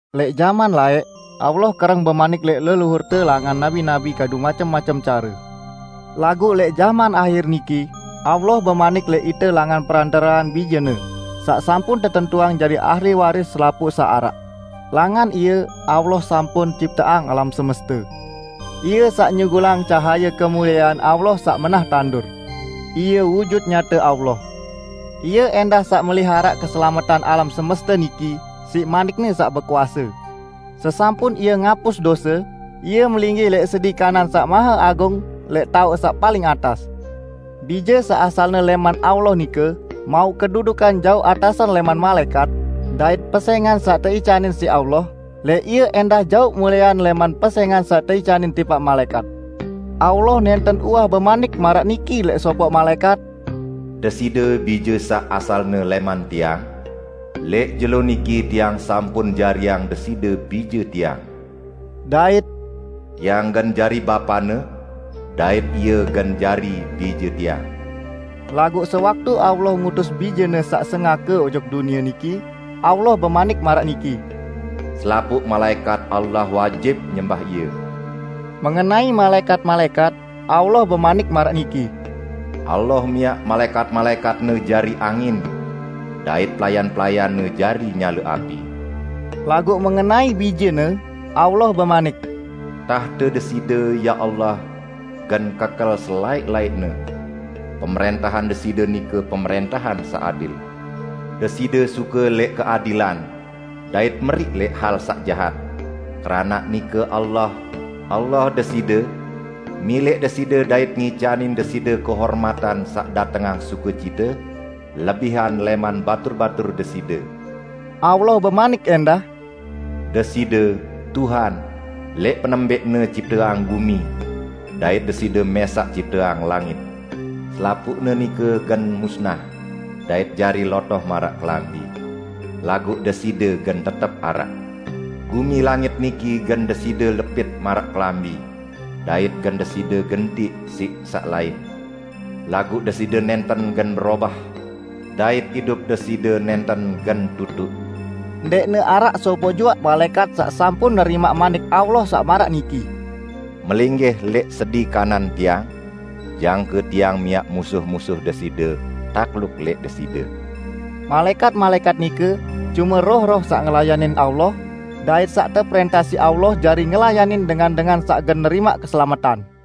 Lẽq jaman laẽq, Allah kereng bemanik lẽq leluhurte langan nabi-nabi kadu macem-macem care. Laguq lẽq jaman ahir niki, Allah bemanik lẽq ite langan perantarean Bije-Ne, saq sampun tetentuang jari ahli waris selapuq saq araq. Langan Ie Allah sampun cipteang alam semeste. Ie saq nyugulang cahaye kemuliean Allah saq menah tandur; Ie wujut nyate Allah. Ie ẽndah saq meliharaq keselametan alam semeste niki siq manik-Ne saq bekuase. Sesampun Ie ngapus dose, Ie melinggih lẽq sedi kanan Saq Maheagung lẽq taoq saq paling atas. Bije saq asalne lẽman Allah nike mauq kedudukan jaoq atasan lẽman malaẽkat, dait pesẽngan saq teicanin siq Allah lẽq Ie ẽndah jaoq muliean lẽman pesẽngan saq teicanin tipaq malaẽkat. Allah nẽnten uwah bemanik maraq niki lẽq sopoq malaẽkat, "Deside Bije saq asalne lẽman Tiang, lẽq jelo niki Tiang sampun jariang Deside Bije Tiang." Dait, "Tiang gen jari Bapa-Ne, dait Ie gen jari Bije Tiang." Laguq sewaktu Allah ngutus Bije-Ne saq sengake ojok dunie niki, Allah bemanik maraq niki, "Selapuq malaẽkat Allah wajib nyembah Ie." Mengenai malaẽkat-malaẽkat, Allah bemanik maraq niki, "Allah miaq malaẽkat-malaẽkat-Ne jari angin, dait pelayan-pelayan-Ne jari nyale api." Laguq mengenai Bije-Ne, Allah bemanik, "Tahte Deside, ya Allah, gen kekel selaẽq-laẽqne! Pemrẽntahan Deside nike pemrẽntahan saq adil. Deside suke lẽq keadilan, dait meriq lẽq hal saq jahat, keranaq nike Allah, Allah Deside, milẽq Deside dait ngicanin Deside kehormatan saq datengang sukecite, lebihan lẽman batur-batur Deside." Allah bemanik ẽndah, "Deside, Tuhan, lẽq penembẽqne cipteang gumi, dait Deside mẽsaq cipteang langit. Selapuqne nike gen musnah, dait jari lotoh maraq kelambi; laguq Deside gen tetep araq. Gumi langit niki gen Deside lepit maraq kelambi, dait gen Deside gentiq siq saq lain. Laguq Deside nẽnten gen berobah, dait idup Deside nẽnten gen tutuq." Ndẽqne araq sopoq juaq malaẽkat saq sampun nerimaq Manik Allah saq maraq niki, "Melinggih lẽq sedi kanan Tiang, jangke Tiang miaq musuh-musuh Deside takluk lẽq Deside." Malaẽkat-malaẽkat nike cume roh-roh saq ngelayanin Allah, dait saq teprẽntah siq Allah jari ngelayanin dengan-dengan saq gen nerimaq keselametan.